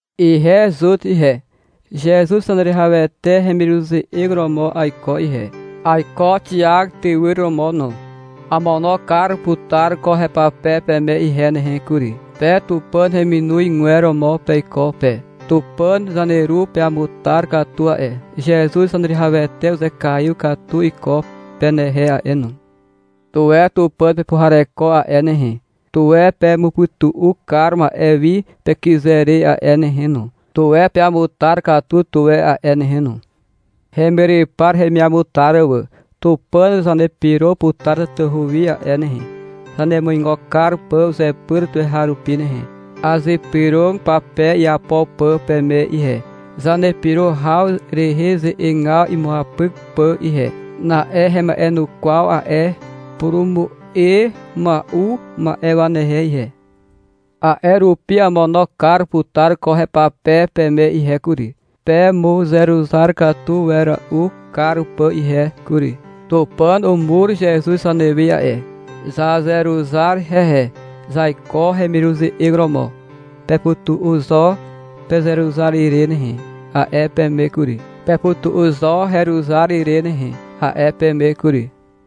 Ihe Zut ihe, Zezuz Zaneruwihawete hemiruze'eg romo aiko ihe. Aiko Xiak tywyr romo no. Amono kar putar ko hepape peme ihe nehe kury. Pe Tupàn heminozgwer romo peiko pe. Tupàn zaneru peamutar katu a'e. Zezuz Zaneruwihawete uzekaiw katu iko penehe a'e no. Tuwe Tupàn pepuhareko a'e nehe. Tuwe pemupytu'u kar ma'e wi pekyze re a'e nehe no. Tuwe peamutar katu tuwe a'e nehe no. Hemyrypar heremiamutar wà. Tupàn zanepyro putar tatahu wi a'e nehe, zanemuigo kar pà uzepyr tuweharupi nehe. Azypyrog pape iapo pà peme ihe, zanepyro haw rehe ze'egaw imuapyk pà ihe. Na'e hema'enukwaw a'e purumu'e mua'u ma'e wanehe ihe. A'e rupi amono kar putar ko hepape peme ihe kury, pemuzeruzar katu wera'u kar pà ihe kury. Tupàn umur Zezuz zanewe a'e. Zazeruzar hehe. Zaiko hemiruze'eg romo. — Pepytu'u zo pezeruzar ire nehe, a'e peme kury. — Pepytu'u zo heruzar ire nehe, a'e peme kury.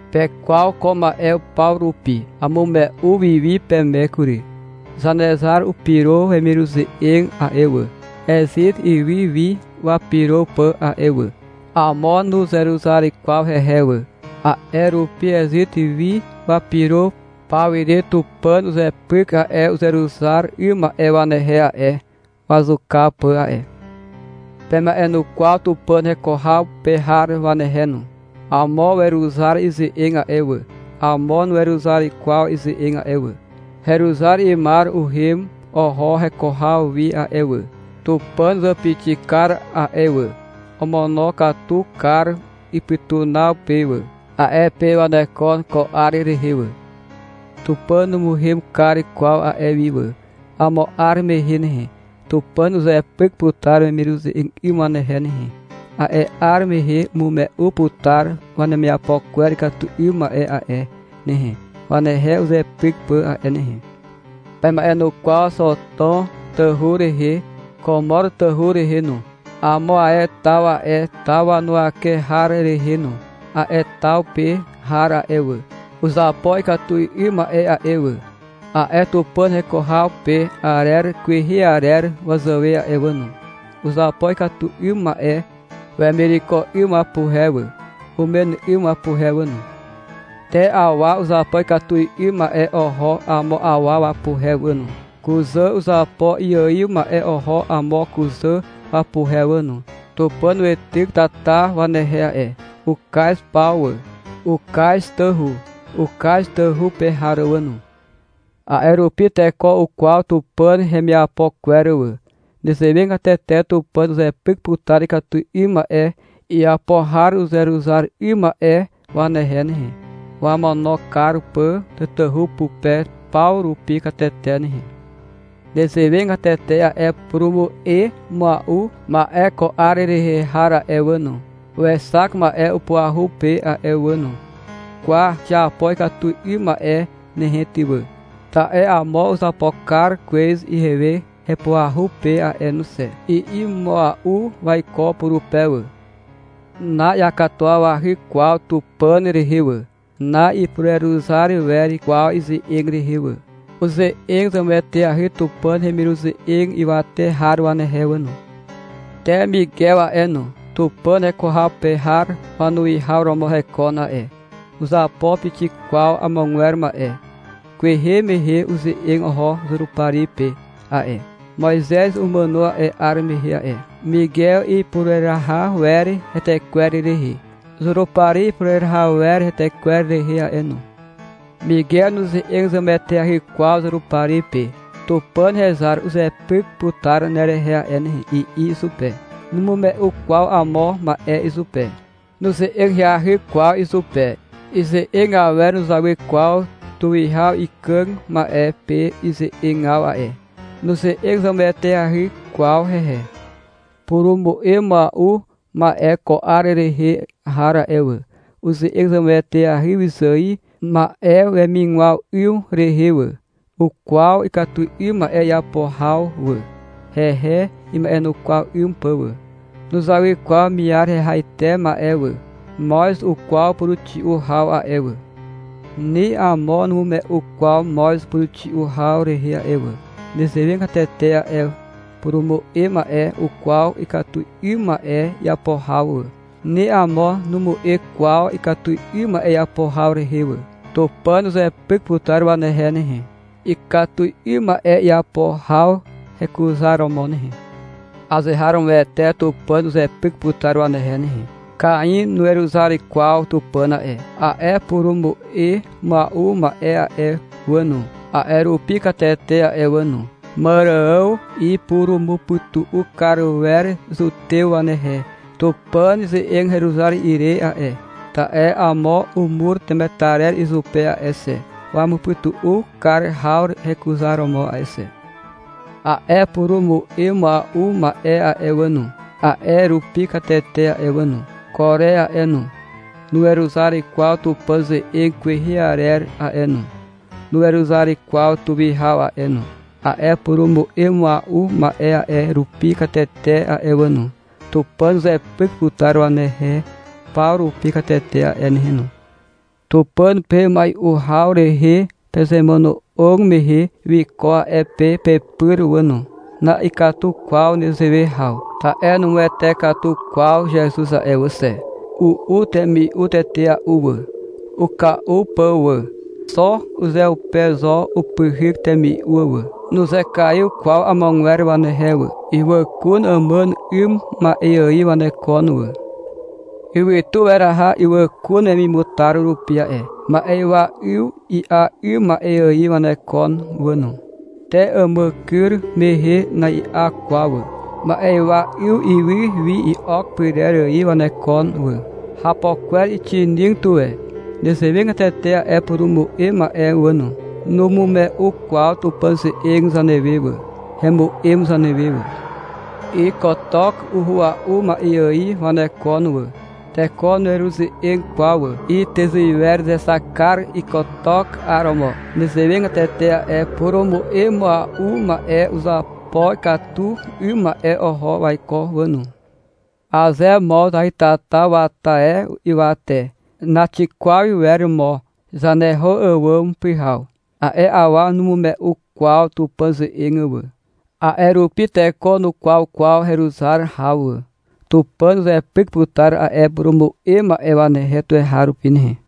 Pekwaw ko ma'e paw rupi. Amume'u wiwi peme kury. Zanezar upyro wemiruze'eg a'e wà, Ezit ywy wi wapyro pà a'e wà. Amo nuzeruzar kwaw hehe wà. A'e rupi Ezit wi wapyro pawire Tupàn uzepyk a'e uzeruzar 'ym ma'e wanehe a'e, wazuka pà a'e. Pema'enukwaw Tupàn heko haw pe har wanehe no. Amo weruzar ize'eg a'e wà. Amo nuweruzar kwaw ize'eg a'e wà. Heruzar 'ymar uhem oho heko haw wi a'e wà. Tupàn uzàpixi kar a'e wà. Omonokatu kar ipytunaw pe wà. A'e pe wanekon ko 'ar rehe wà. Tupàn numuhem kar kwaw a'e wi wà. Amo 'ar mehe nehe, Tupàn uzepyk putar wemiruze'eg 'ym wanehe nehe. A'e 'ar mehe umume'u putar wanemiapo kwer ikatu 'ym ma'e a'e nehe, wanehe uzepyk pà a'e nehe. Pema'enukwaw Xotom tawhu rehe, Komor tawhu rehe no, amo ae taw a'e taw wanuwake har rehe no. A'e taw pe har a'e wà, uzapo ikatu 'ym ma'e a'e wà, a'e Tupàn heko haw pe arer kwehe arer wazàwe a'e wà no. Uzapo ikatu 'ym ma'e wemireko 'ym wapuhe wà, umen 'ym wapuhe wà no. Te awa uzapo ikatu 'ym ma'e oho amo awa wapuhe wà no. Kuzà uzapo iaiw ma'e oho amo kuzà wapuhe wà no. Tupàn weityk tata wanehe a'e. Ukaz paw wà. Ukaz tawhu. Ukaz tawhu pe har wà no. A'e rupi teko ukwaw Tupàn hemiapo kwer wà. Nezewegatete Tupàn uzepyk putar ikatu 'ym ma'e iapo har uzeruzar 'ym ma'e wanehe nehe, wamono kar pà tatahu pupe paw rupi katete nehe. Nezewegatete a'e purumu'e mua'u ma'e ko 'ar rehe har a'e wà no, wexak ma'e upuahu pe a'e wà no. — Kwa, xiapo ikatu 'ym ma'e nehe ty wà, ta'e amo uzapo kar kwez ihewe hepuahu pe a'e no xe, i'i mua'u waiko purupe wà. Na'iakatuwawahy kwaw Tupàn rehe wà, na'ipureruzar wer kwaw ize'eg rehe wà. Uze'eg zemueteahy Tupàn hemiruze'eg ywate har wanehe wà no. Te Migew a'e no. Tupàn heko haw pe har wanuwihaw romo hekon a'e. Nuzapo pixik kwaw agwer ma'e. Kwehe mehe uze'eg oho Zurupari pe a'e. Moizez umàno a'e 'ar mehe a'e. Migew ipureraha wer hetekwer rehe. Zurupari ipureraha wer hetekwer rehe a'e no. Migew nuze'eg zemueteahy kwaw Zurupari pe. — Tupàn hezar uzepyk putar nerehe a'e nehe, i'i izupe. Numume'u kwaw amo ma'e izupe. Nuze'eg ahyahy kwaw izupe. Ize'eg awer nuzawy kwaw tuwihaw ikàg ma'e pe ize'egaw a'e. Nuze'eg zemueteahy kwaw hehe. Purumu'e mua'u ma'e ko 'ar rehe har a'e wà, uze'eg zemueteahy wyzài ma'e wemigwaw 'ym rehe wà. Ukwaw ikatu 'ym ma'e iapo haw wà, hehe ima'enukwaw 'ym pà wà. Nuzawy kwaw miar hehaite ma'e wà. Moz ukwaw puruxi'u haw a'e wà. Ni amo numu'e kwaw moz puruxi'u haw rehe a'e wà. Nezewegatete a'e purumu'e ma'e ukwaw ikatu 'ym ma'e iapo haw wà. Ni amo numu'e kwaw ikatu 'ym ma'e iapo haw rehe wà. Tupàn uzepyk putar wanehe nehe, ikatu 'ym ma'e iapo haw hekuzaromo nehe. Azeharomoete Tupàn uzepyk putar wanehe nehe. Kain nuweruzar kwaw Tupàn a'e. A'e purumu'e mua'u ma'e a'e wà no, a'e rupi katete a'e wà no. Màrààw ipurumupytu'u kar wer Zutew wanehe Tupàn ze'eg heruzar ire a'e, ta'e amo umur temetarer izupe a'e xe, wamupytu'u kar haw hekuzaromo a'e xe. A'e purumu'e mua'u ma'e a'e wà no, a'e rupi katete a'e wà no. Kore a'e no, nuweruzar kwaw Tupàn ze'eg kwehe arer a'e no. Nuweruzar kwaw tuwihaw a'e no. A'e purumu'e mua'u ma'e a'e rupi katete a'e wà no. Tupàn uzepyk putar wanehe paw rupi katete a'e nehe no. Tupàn pe mai'u haw rehe pezemono'og mehe, wiko a'e pe pepyr wà no. Na'ikatu kwaw nezewe haw, ta'e numuwete katu kwaw Zezuz a'e wà xe. U'u temi'u tetea'u wà, uka'u pà wà. Xo uzeupe zo upyhyk temi'u wà. Nuzekaiw kwaw amogwer wanehe wà. Ywàkun àmàn 'ym ma'e ài wanekon wà. Ywytu weraha ywàkun wemimutar rupi a'e. Ma'ywa 'yw i'a 'ym ma'e ài wanekon wà no. Te àmàkyr mehe na'i'a kwaw wà. Ma'ywa 'yw ywy wi i'ok pyrer ài wanekon wà. Hapo kwer uxinig tuwe. Nezewegatete a'e purumu'e ma'e wà no. Numume'u kwaw Tupàn ze'eg zanewe wà. Hemu'em zanewe wà. Ykotok uhua'u ma'e ài wanekon wà. Teko nueruze'eg kwaw wà. Ytyzuiwer uzexak kar ykotok 'aromo. Nezewegatete a'e purumu'e mua'u ma'e uzapo ikatu 'ym ma'e oho waiko wà no. Aze mo zahytata wata e ywate, naxikwaw iwer mo zaneho àwàm pyhaw. A'e awa numume'u kwaw Tupàn ze'eg wà. A'e rupi teko nukwaw kwaw heruzar haw wà. Tupàn uzepyk putar a'e purumu'e ma'e wanehe tuweharupi nehe.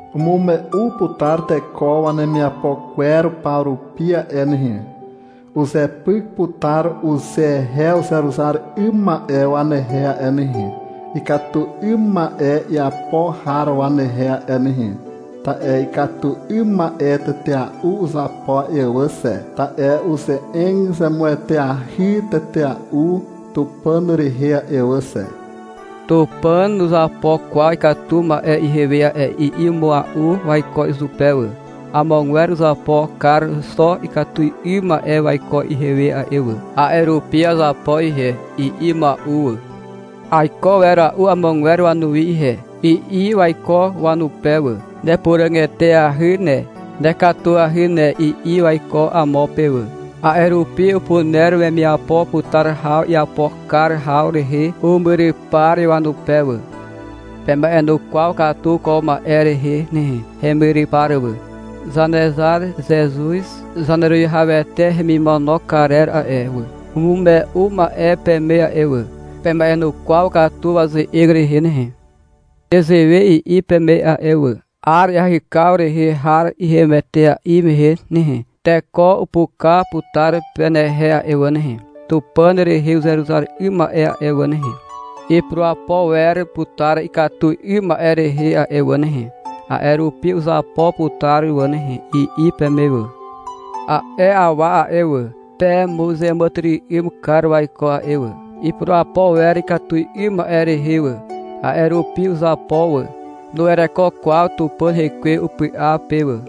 Umume'u putar teko wanemiapo kwer paw rupi a'e nehe. Uzepyk putar uzehe uzeruzar 'ym ma'e wanehe a'e nehe, ikatu 'ym ma'e iapo har wanehe a'e nehe. Ta'e ikatu 'ym ma'e tetea'u uzapo a'e wà xe. Ta'e uze'eg zemueteahy tetea'u Tupàn rehe a'e wà xe. Tupàn nuzapo kwaw ikatu ma'e ihewe a'e, i'i mua'u waiko izupe wà. — Amogwer uzapo kar xo ikatu 'ym ma'e waiko ihewe a'e wà, a'e rupi azapo ihe, i'i mua'u wà. — Aiko wera'u amogwer wanuwi ihe, i'i waiko wanupe wà. — Nepuràg eteahy ne, nekatuahy ne, i'i waiko amo pe wà. A'e rupi upuner wemiapo putar haw iapo kar haw rehe umyrypar wanupe wà. Pema'enukwaw katu ko ma'e rehe nehe, hemyrypar wà. Zanezar Zezuz Zaneruwihawete hemimono karer a'e wà, umume'u ma'e peme a'e wà. Pema'enukwaw katu waze'eg rehe nehe. Nezewe i'i peme a'e wà. — 'Ar iahykaw rehe har ihem etea'i mehe nehe, teko upuka putar penehe a'e wà nehe. Tupàn rehe uzeruzar 'ym ma'e a'e wà nehe, ipurapo wer putar ikatu 'ym ma'e rehe a'e wà nehe. A'e rupi uzapo putar wà nehe, i'i peme wà. A'e awa a'e wà, pemuzeàmàtyry'ym kar waiko a'e wà. Ipurapo wer ikatu 'ym ma'e rehe wà. A'e rupi uzapo wà. Nuwereko kwaw Tupàn Hekwe upy'a pe wà.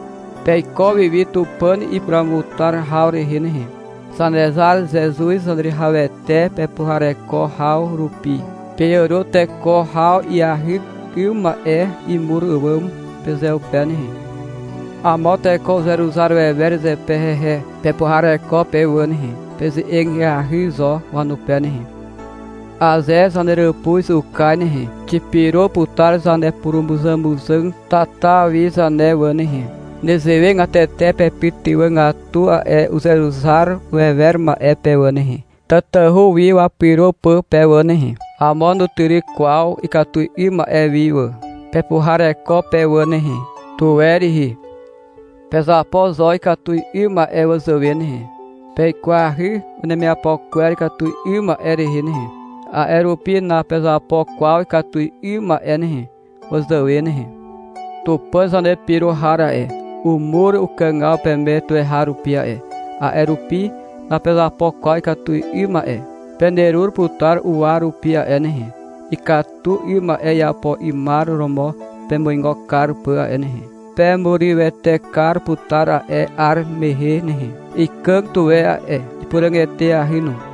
Peiko wiwi Tupàn ipuruamutar haw rehe nehe. Zanezar Zezuz Zaneruwihawete pepuhareko haw rupi, peàro teko haw iahyk 'ym ma'e imur àwàm pezeupe nehe. Amo teko uzeruzar wewer zepe hehe. Pepuhareko pe wà nehe. Peze'eg ahyahy zo wanupe nehe. Aze zaneràpuz ukaz nehe, xipyro putar zanepurumuzàmuzàg tata wi zane wà nehe. Nezewegatete pepytywàgatu a'e uzeruzar wewer ma'e pe wà nehe, tatahu wi wapyro pà pe wà nehe. Amo nutyryk kwaw ikatu 'ym ma'e wi wà. Pepuhareko pe wà nehe. Tuwe rihi. Pezapo zo ikatu 'ym ma'e wazàwe nehe. Peikwahy wanemiapo kwer ikatu 'ym ma'e rehe nehe. A'e rupi napezapo kwaw ikatu 'ym ma'e nehe, wazàwe nehe. Tupàn zanepyro har a'e, umur ukàgaw peme tuweharupi a'e, a'e rupi napezapo kwaw ikatu 'ym ma'e. Penerur putar uwa rupi a'e nehe, ikatu 'ym ma'e iapo 'ymar romo pemuigo kar pà a'e nehe. Pemurywete kar putar a'e 'ar mehe nehe. Ikàg tuwe a'e, ipuràg eteahy no.